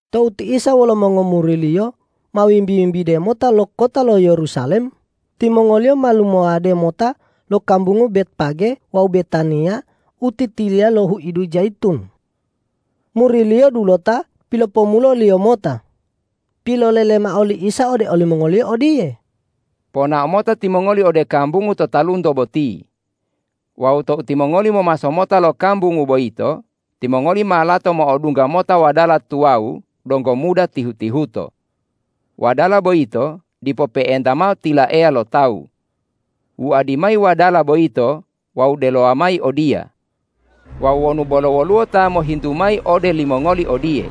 Tou ti Isa wolo mongomuri-Liyo ma wimbi-wimbide mota lo kota lo Yerusalem, timongoliyo ma lumawode mota lo kambungu Betpage wawu Betaniya u titiliya lo huidu Jayitun. Muri-Liyo dulota pilopomulo-Liyo mota. Pilolele mao li Isa ode olimongoliyo odiye,”Ponao mota timongoli ode kambungu to talunto boti. Wawu tou timongoli momaso mota lo kambungu boyito, timongoli ma lato mo'odungga mota wadala tuwawu donggo muda tihu-tihuto. Wadala boyito dipo pe'enta mao tilaeya lo tawu. Wuadi mayi wadala boyito wawu delowa mayi odiya. Wawu wonu bolo woluwo ta mohintu mayi ode limongoli odiye,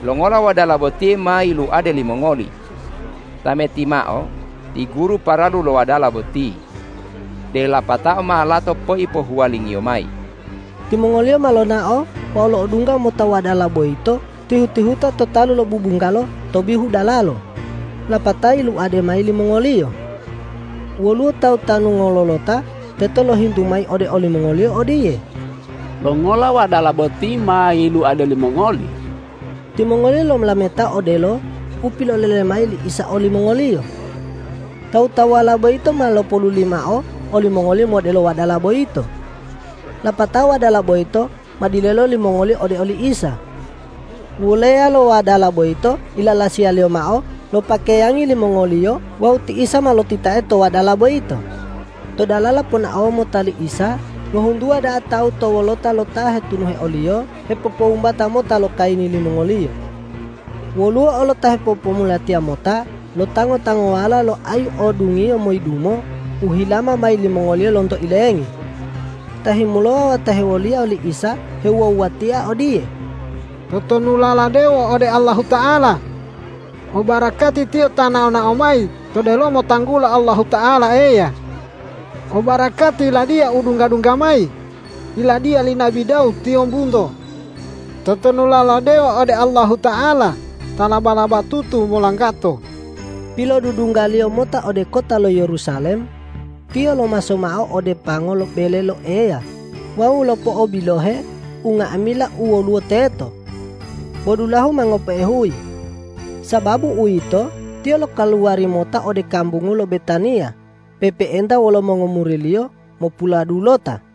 ’Longola wadala botiye ma yiluade limongoli?’ tameti mao: Ti Guru paralu lo wadala boti. De lapatao ma lato poipohuwalingiyo mayi.” Timongoliyo ma lonao wawu lo'odungga mota wadala boyito tihu-tihuta to talu lo bubunggalo to bihu dalalo, lapatao yiluade mayi limongoliyo. Woluwo tawu tanu ngololota teto lohintu mayi ode olimongoliyo odiye,”Longola wadala boti ma yiluade limongoli?” Timongoliyo lolametao odelo u pilolele mayi li Isa olimongoliyo. Tawu-tawuwala boyito ma lopoluli mao olimongoliyo modelo wadala boyito. Lapatao wadala boyito ma dilelo limongoliyo ode oli Isa. Wuleya lo wadala boyito ilalasiyaliyo mao lo pakeyangi limongoliyo wawu ti Isa ma lotitae to wadala boyito. To dalala ponaowa mota li Isa ngohuntuwa da'a tawu to wolota lo ta hetunuhe o-Liyo hepopowumbata mota lo kayini limongoliyo. Woluwo olo ta hipopomulatiya mota lo tango-tangowala lo ayu o dungiyo moyidumo u hilama mayi limongoliyo lonto ilengi. Ta himulowa wawu ta hewoliya li Isa hewuwa-wuwatia odiye,”Totonulala dewo ode Allahuta'ala! Obarakati Tiyo ta nao-nao mayi to delomo tanggulo Allahuta'ala Eya! Obarakati Yiladiya u dungga-dungga mayi, Yiladiya li nabi Dawud tiyombunto! Totonulala dewo ode Allahuta'ala ta laba-labatutu molanggato!” Pilodudungga-Liyo mota ode kota lo Yerusalem, Tiyo lomaso mao ode pango bele lo Eya wawu lopo'obilohe unga'amila u woluwo teto. Bo dulahu ma ngope'e huyi. Sababu uwito, Tiyo lokaluwari mota ode kambungu lo Betaniya pe'epe'enta wolo mongomuri-Liyo mopuladulota.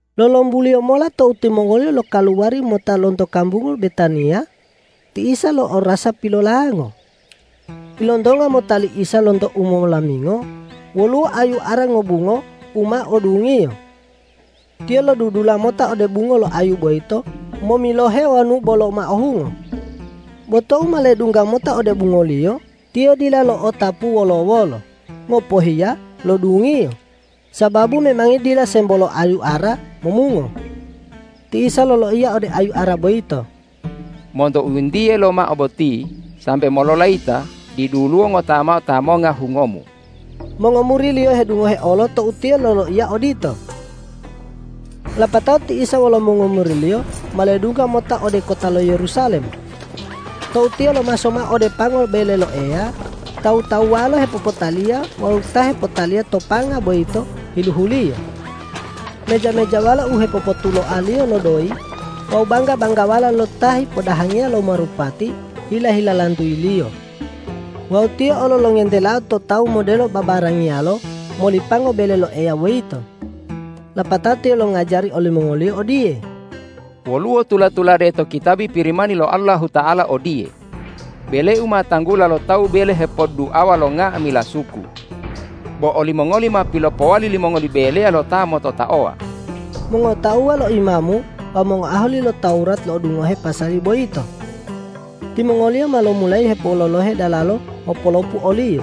Lolombuliyo mola tou timongoliyo lokaluwari mota lonto kambungu Betaniya, ti Isa lo'orasa pilolango. Ilontonga mota li Isa lonto umolamingo woluwo ayu ara ngobungo u ma o dungiyo. Tiyo lodudula mota ode bungo lo ayu boyito momilohe wonu bolo ma o hungo. Bo tou ma ledungga mota ode bungoliyo, Tiyo dila lo'otapu wolo-wolo, ngopohiya lo dungiyo, sababu memangi dila sembo lo ayu ara momungo. Ti Isa loloiya ode ayu ara boyito,”Monto u yintiye lomao boti sambe mololayita diduluwo ngota mao ta monga hungomu!” Mongomuri-Liyo hedungohe olo tou Tiyo loloiya odito. Lapatao ti Isa wolo mongomuri-Liyo ma ledungga mota ode kota lo Yerusalem. Tou Tiyo lomaso mao ode pango bele lo Eya, tawu-tawuwalo hepopotaliya wawu ta hepotaliya to panga boyito hiluhu-Liyo. Meja-mejawalo u hepopotuloaliyo lo doyi wawu bangga-banggawala lo ta hipodahangiya lo marupati hila-hilalantuyi-Liyo. Wawu Tiyo olo longentelao to tawu modelo babarangiyalo moli pango bele lo Eya boyito. Lapatao Tiyo longajari olimongoliyo odiye,”Woluwo tula-tulade to kitabi Pirimani lo Allahuta'ala odiye, ’Bele-U ma tanggula lo tawu bele hepodduawa lo nga'amila suku.’ Bo olimongoli ma pilopowali limongoli beleya lo ta mototaowa!” Mongotauwa lo imamu wawu mongoahali lo Tawurat lo'odungoheo pasali boyito. Timongoliyo ma lomulayi hepololohe dalalo mopolopu o-Liyo,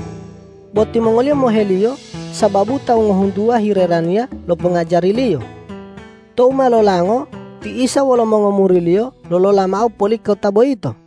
bo timongoliyo mohe-Liyo sababu tawu ngohuntuwa hiheraniya lo pongajari-Liyo. Tou ma lolango ti Isa wolo mongomuri-Liyo lolola mao poli kota boyito.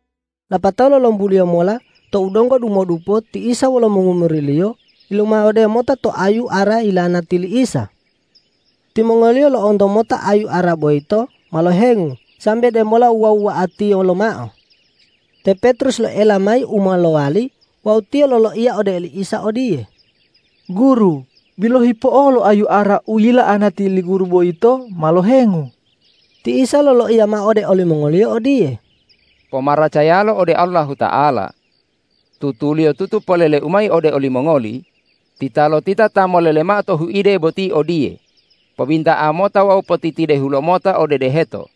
Lapatao lolombuliyo mola tou donggo dumodupo ti Isa wolo mongomuri-Liyo yilumawode mota to ayu ara yila'anati li Isa. Timongoliyo lo'onto mota ayu ara boyito ma lohengu sambe demola wuwa-wuwa'atiyo lomao. Te Petrus loela mayi u ma lowali wawu tiyo loloiya ode li Isa odiye,”Guru, bilohi po'olo ayu ara u yila'anati li Guru boyito ma lohengu.” Ti Isa loloiya mao ode olimongoliyo odiye,”Pomaracayalo ode Allahuta'ala! Tutuliyotutu polele-U mayi ode olimongoli: Titalotita ta molele mao to huide boti odiye, ’Pobinta'a mota wawu potitidehu lomota ode deheto!’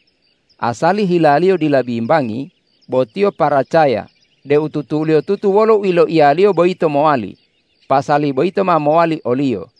asali hilaliyo dila bimbangi, bo tiyo paracaya deu tutuliyotutu wolo u yiloiyaliyo boyito mowali, pasali boyito ma mowali oliyo.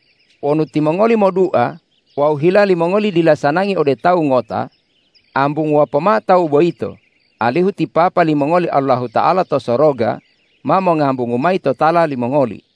Wonu timongoli modua wawu hila limongoli dila sanangi ode tawu ngota, ambunguwa pomao tawu boyito, alihu ti Papa limongoli Allahuta'ala to soroga ma mongambungu mayi totala limongoli.”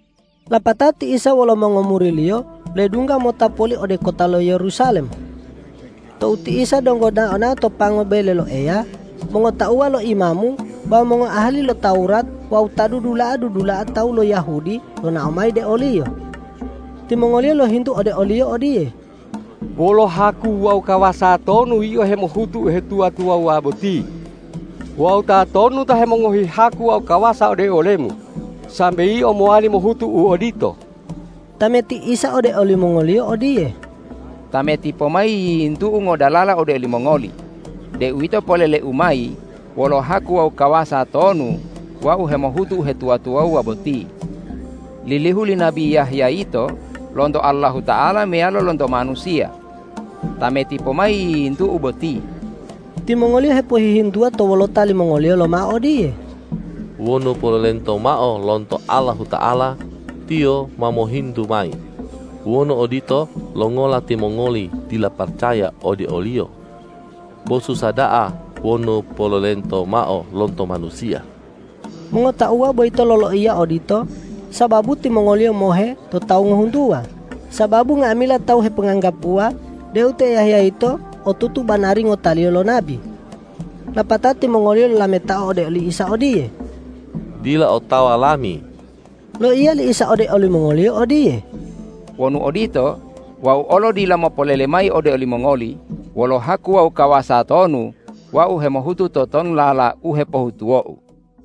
Lapatao ti Isa wolo mongomuri-Liyo ledungga mota poli ode kota lo Yerusalem. Tou ti Isa donggo nao-nao to pango bele lo Eya, mongotauwa lo imamu wawu mongoahali lo Tawurat wawu ta dudula'a-dudula'a tawu lo Yahudi lonao mayi de o-Liyo. Timongoliyo lohintu ode o-Liyo odiye,”Wolo haku wawu kawasa tonu Yio hemohutu uhetuwa-tuwawuwa boti? Wawu tatonu ta hemongohi haku wawu kawasa ode ole-Mu, sambe Yio mowali mohutu u odito?” Tameti Isa ode olimongoliyo odiye,”Tameti pomayi yiyintu-U ngodalala ode olimongoli deuwito polele-U mayi wolo haku wawu kawasa tonu Wau hemohutu uhetuwa-tuwawuwa boti. Lilihu li nabi Yahya yito lonto Allahuta'ala meyalo lonto manusiya? Tameti pomayi yiyintu-U boti!” Timongoliyo hepohihintuwa to wolota limongoliyo lomao odiye,”Wonu polelento mao lonto Allahuta'ala, Tiyo ma mohintu mayi: Wonu odito, longola timongoli dila paracaya ode oliyo? Bo susa da'a wonu polelento mao lonto manusiya!” Mongotauwa boyito loloiya odito sababu timongoliyo mohe lo tawu ngohuntuwa, sababu nga'amila tawu heponganggapuwa deu te Yahya yito otutu banari ngotaliyo lo nabi. Lapatao timongoliyo lolametao ode li Isa odiye,”Dila otawa lami.” Loiya li Isa ode olimongoliyo odiye,”Wonu odito, Wau olo dila mopolele mayi ode olimongoli wolo haku wawu kawasa tonu Wau hemohutu totonulala u hepohutuwo-U.”